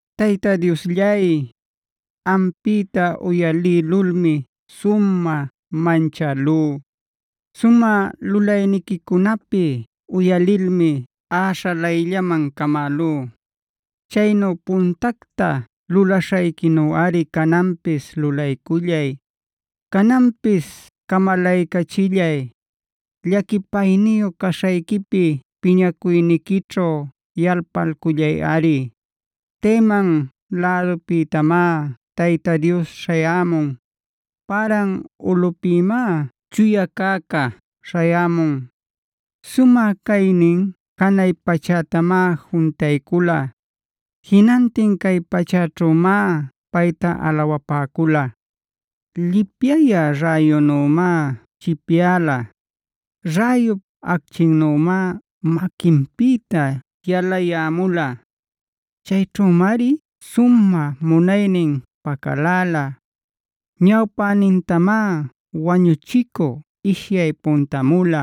Tayta Diosllay, ampïta uyalïlulmi sumä manchälú; sumä lulayniquicunapi uyalilmi äśhalayllaman camälú. Chaynu puntacta lulaśhayquinuꞌari cananpis lulaycullay, cananpis camalaycachillay. Llaquipayniyu caśhayquipi piñacuyniquićhu yalpalcullayꞌari. Teman lädupïtamá Tayta Dios śhayämun; Paran ulꞌupïmá Chuya Cäca śhayämun. Selah Sumä caynin janay pachätamá juntaycula; jinantin cay pachäćhümá payta alawapäcula. Llipyayä räyunümá chipyala; räyup achquinnümá maquinpïta yalayämula. Chayćhümari sumä munaynin pacaläla. Ñawpänintamá wañuchicü ishyay puntamula.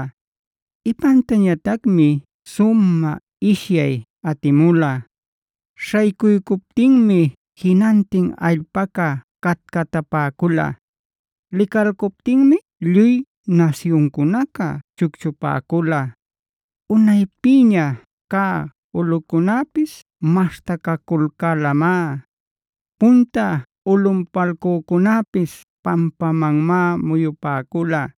Ipantañatacmi sumä ishyay atimula. Śhaycuycuptinmi jinantin allpaca catcatapäcula; licalcuptinmi lluy nasyuncunaca chucchupäcula. Unaypïña cä ulꞌucunäpis maśhtacaculcälamá. Punta ulꞌunpalcücunäpis pampamanmá muyupäcula.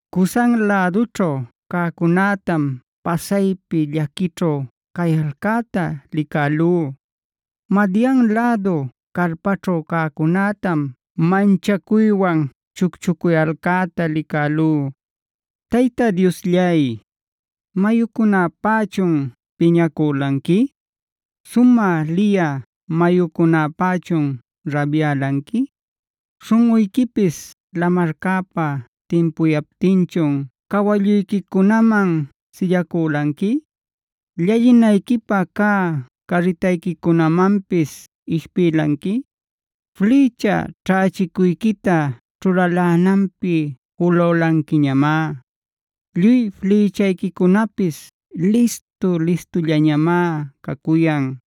Cusan lädućhu cäcunätam pasaypi llaquićhu cayalcäta licälú. Madian lädu carpaćhu cäcunätam manchacuywan chucchuyalcäta licälú. Tayta Diosllay, ¿mayucunäpächun piñacülanqui? ¿Sumä liyä mayucunäpächun rabyälanqui? ¿Śhunꞌuyquipis lamarcäpä timpuyaptinchun cawalluyquicunaman sillacülanqui, llallinayquipä cä carritayquicunamanpis ishpïlanqui? Flïcha ćhächicuyquita ćhulalänanpi julülanquiñamá. Lluy flïchayquicunapis listu-listullañamá cacuyan. Selah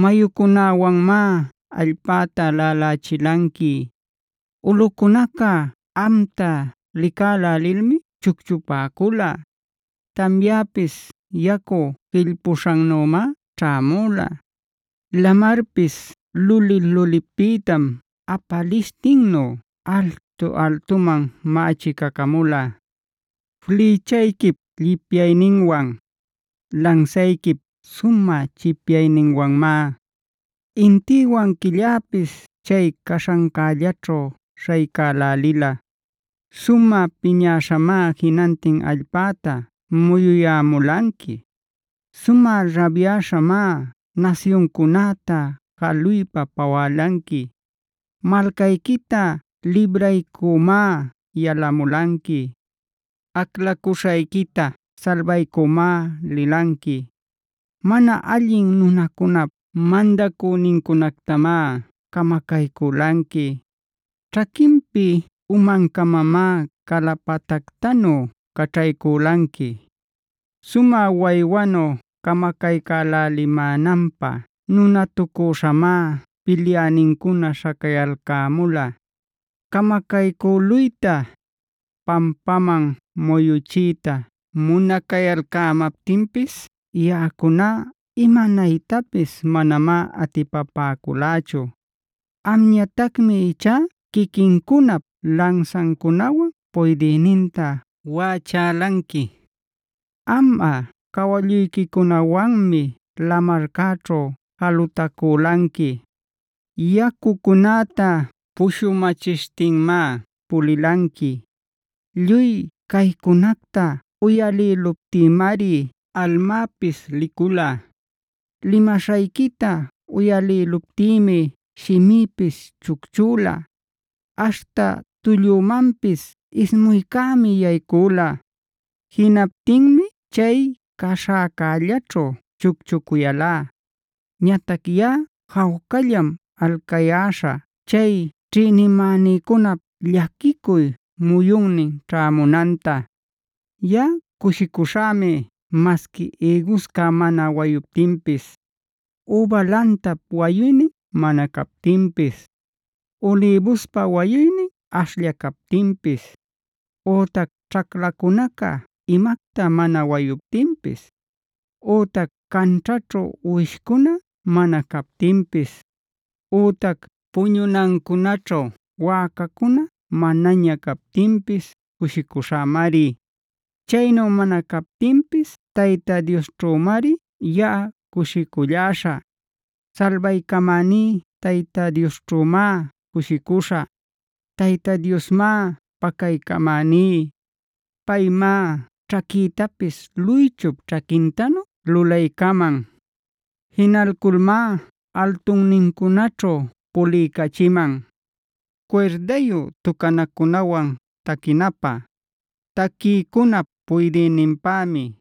Mayucunäwanmá allpäta laꞌalächilanqui. Ulꞌucunaca amta licälälilmi chucchupäcula. Tamyapis yacu jillpüśhanümá ćhämula; lamarpis luli-lulipïtam apalishtinnu altu-altuman mächicacamula. Flïchayquip llipyayninwan, lansayquip sumä chipyayninwanmá intïwan quilläpis chay caśhancällaćhu śhaycälälila. Sumä piñäśhamá jinantin allpäta muyuyämulanqui. Sumä rabyäśhamá nasyuncunäta jaluypa pawälanqui. Malcayquita libraycümá yalamulanqui. Aclacuśhayquita salbaycümá lilanqui. Mana allin nunacunap mandacünincunactamá camacaycülanqui; ćhaquinpi umancamamá calapatactanu caćhaycülanqui. Sumä waywanu camacaycälälimänanpä nunatucüśhamá pilyänincuna śhacayalcämula. Camacaycüluyta, pampaman muyuchiyta munacayalcämaptinpis yaꞌacuná imanaytapis manamá atipapäculächu. Amñatacmi ichá quiquincunap lansancunawan puydïninta waꞌachälanqui. Amꞌa cawalluyquicunawanmi lamarcäćhu jalutaculanqui; yacucunäta pushumachishtinmá pulilanqui. Lluy caycunacta uyalïluptïmari almäpis licula. Limaśhayquita uyalïluptïmi shimïpis chucchüla. Aśhta tullümanpis ismuycämi yaycüla; jinaptinmi chay caśhäcällaćhu chucchuyälá. Ñatac yaꞌa jawcallam alcayäśhä chay ćhïnimänïcunap llaquicuy muyunnin ćhämunanta. Yaꞌa cushicuśhämi masqui ïgusca mana waytaptinpis; üba lantap wayuynin mana captinpis, ulïbuspa wayuynin ashlla captinpis, ütac ćhaclacunaca imacta mana wayuptinpis, ütac canćhaćhu uwishcuna mana captinpis, ütac puñunancunaćhu wäcacuna manaña captinpis cushicuśhämari. Chaynu mana captinpis Tayta Diosćhümari yaꞌa cushiculläśhä; salbaycamäní Tayta Diosćhümá cushicuśhä. Tayta Diosmá pacaycamäní; paymá ćhaquïtapis luychup ćhaquintanu lulaycaman; jinalculmá altunnincunaćhu puliycachiman.c Cuirdayu tucanacunawan taquinapä; taquïcunap puydïninpämi.